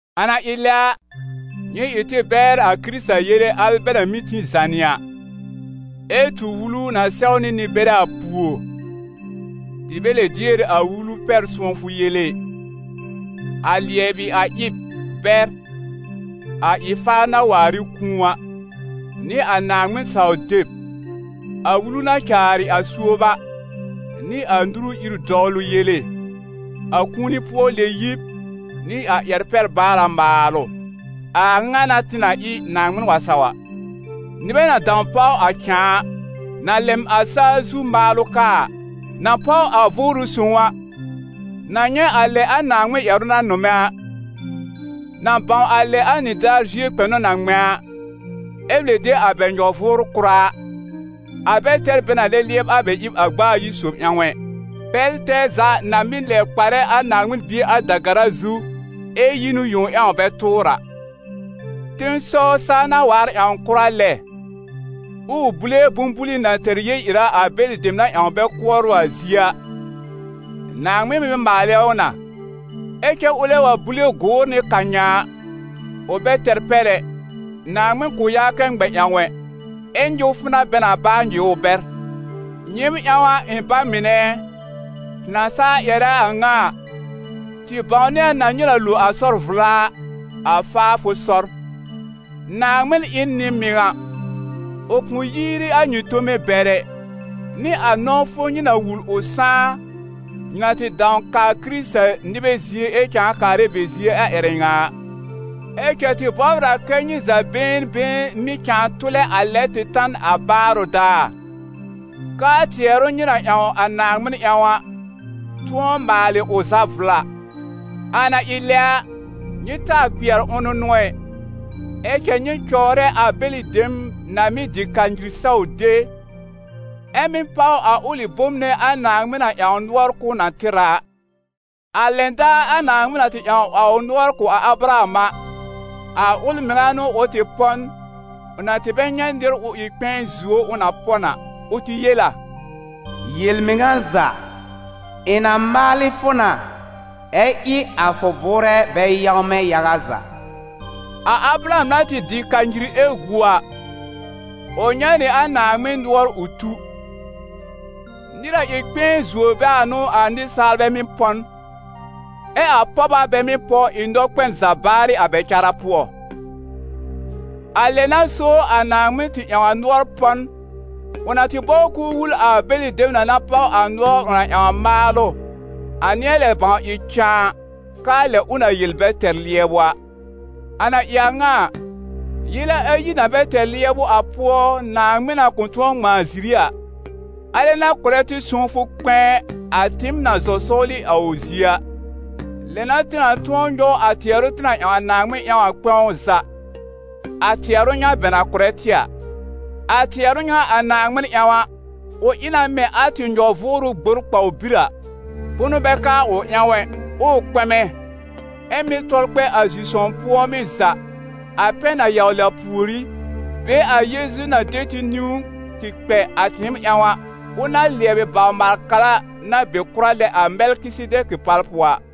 A na ɩ lɛ a, nyɩ ɩ tɩ bɛr a Kɩrɩta yele al bɛ na mɩ́ tĩ zànɩ a, ɛ tu wulu na sɛwnɩ nɩ-bɛrɛ a pùor, tɩ bɛ lɛb dier a wulu pɛr-sʋ̃ɔfʋ yele ɩ: a lɩɛbɩ-a-ɩb bɛr a ɩ-faar na waar ɩ kũu a, nɩ a Naaŋmɩn-saw-deb, a wulu na caarɩ a suob a, nɩ a nuru ir-dɔwlʋ yele, a kũuni-pʋɔ-lɛ-yib nɩ a ƴɛr-pɛ-baara maalʋ. A a ŋa n'a tɩ na ɩ, Naaŋmɩn wa saw a. Nɩbɛ na dãw páw a cãa a, na lɛm a saa zu maalʋ kaa a, na páw a Vʋʋrʋ Sõw a, na nyɛ̃ a lɛ a Naaŋmɩn ƴɛrʋ na nʋmɛ a, na bãw a lɛ a nɩdaar zie kpɛnʋ na ŋmɛ̃ a, ɛ́ lɛb de a bɛ nyɔ-vʋʋr-kʋra a, a bɛ tɛr bɛ na lɛb lɩɛbɩ a bɛ ɩb a gb'a ayi sob ƴãw ɛ, bɛl tɛɛ za n'a mɩ́ lɛ kparɛ a Naaŋmɩn Bie a da-gara zu, ɛ yi n ʋ yẽw ƴãw bɛ tʋʋr a. Tẽsɔw, saa na waar ƴãwn kʋra lɛ, ɛ ʋ búlé bʋ̃-buli na tɛr yel-ɩra a bɛlɩ dem na ƴãw bɛ kʋɔr ʋ a zie a, Naaŋmɩn mɩ́ maalɛ ʋ na. Ɛ cɛ ʋlɛ wa búlé gʋʋr nɩ karnyã a, ʋ bɛ tɛr pɛr ɛ, Naaŋmɩn kʋ̃ yaa kɛ ŋmɛ ƴãw ʋ ɛ, ɛ nyɩwfʋ n'a bɛ nãà baa nyɩw ʋ bɛr. Nyɩɩm ƴãw a, ɩ̃ ba mɩnɛ ɛ, tɩ na saa ƴɛrɛ a a ŋa a, tɩ bãwnɩ a n'a nyɩ na lo a sɔr-vla a, a faafʋ sɔr. Naaŋmɩn ɩ n nɩ-mɩŋa, ʋ kʋ̃ yiiri a nyɩ tome bɛr ɛ, nɩ a ʋ nɔ̃wfʋ nyɩ na wul ʋ sãá, nyɩ na tɩ dãw kaa Kɩrɩta-nɩbɛ zie ɛ cãa kaarɛ a bɛ zie a ƴɛrɛ ŋa a. Ɛ cɛ tɩ bɔbr a kɛ́ nyɩ za been been mɩ́ cãa tʋlɛ a lɛ tɩ ta n a baarʋ daar, kɛ́ a tɩɛrʋ nyɩ na ƴãw a Naaŋmɩn ƴãw a, tʋ̃ɔ maalɩ ʋ za vla. A na ɩ lɛ a, nyɩ taa kpɩɛr ʋ̃nʋnʋ ɛ, ɛ cɛ nyɩ cɔwrɛ a bɛlɩ dem na mɩ́ dɩ kanyir saw de, ɛ mɩ́ páw a ʋlɩ bom nɛ a Naaŋmɩn na ƴãw nʋɔr k'ʋʋ na tɩr a a. A lɛn daar a Naaŋmɩn na tɩ ƴãw a ʋ nʋɔr kʋ̀ a Abraham a, a ʋl mɩŋa n'ʋ ʋ tɩ pɔ n, ʋ na bɛ tɩ nyɛ̃ nɩr ʋ ɩ kpɛ̃ɛ zuo ʋ, ʋ na pɔ n a. Ʋ tɩ yel a: «Yel-mɩŋa za, ɩ̃ na maalɩ fʋ na, ɛ ɩ a fʋ bʋʋrɛ bɛ yãwmɛ yaga za.» A Abraham na tɩ dɩ kanyir ɛ gu a, ʋ nyɛ̃ nɩ a Naaŋmɩn nʋɔr ʋ tu. Nɩr na ɩ kpɛ̃ɛ zuo bɛ a n'ʋ a nɩsaalbɛ mɩ́ pɔ n, ɛ a pɔb a bɛ mɩ́ pɔ, ɩ nɔkpɛn za baarɩ a bɛ cara pʋɔ. A lɛ n'a so a Naaŋmɩn tɩ ƴãw a nʋɔr pɔ n, ʋ na tɩ bɔbr k'ʋʋ wul a bɛlɩ dem na na páw a nʋɔr ʋ na ƴãw a maalʋ, a nɩ̃ɛ lɛ bãw ɩ cãa a, k'aa lɛ ʋ na yel a bɛ tɛr lɩɛbʋ a. A na ɩ a ŋa a, yele ayi na bɛ tɛr lɩɛbʋ a pʋɔ, Naaŋmɩn na kʋ̃ tʋ̃ɔ ŋmãa ziri a, alɛ n'a kʋ̀rɛ tɩ sõwfʋ kpɛ̃ɛ a tɩɩm na zɔ sɔwlɩ a ʋ zie a. Lɛ n'a tɩ na tʋ̃ɔ nyɔw a tɩɛrʋ tɩ na ƴãw a Naaŋmɩn ƴãw a kpɛ̃w za, a tɩɛrʋ ŋa bɛ na kʋ̀rɛ tɩ a. A tɩɛrʋ ŋa a Naaŋmɩn ƴãw a, ʋ ɩ na mɛ̃ a tɩ nyɔ-vʋʋrʋ gbor kpawbir a, bʋnʋ bɛ ka a ʋ ƴãw ɛ, ʋʋ kpɛmɛ, ɛ mɩ́ tɔl kpɛ a zi-sõw pʋ̃ɔmɩ́ za, a pɛn na yawlɩ a pùorí, be a Yeezu na de tɩ niwn tɩ kpɛ a tɩɩm ƴãw a, ʋl na lɩɛbɩ bawr-maal-kara na be kʋra lɛ a Mɛlkɩsedɛkɩ pal pʋɔ a.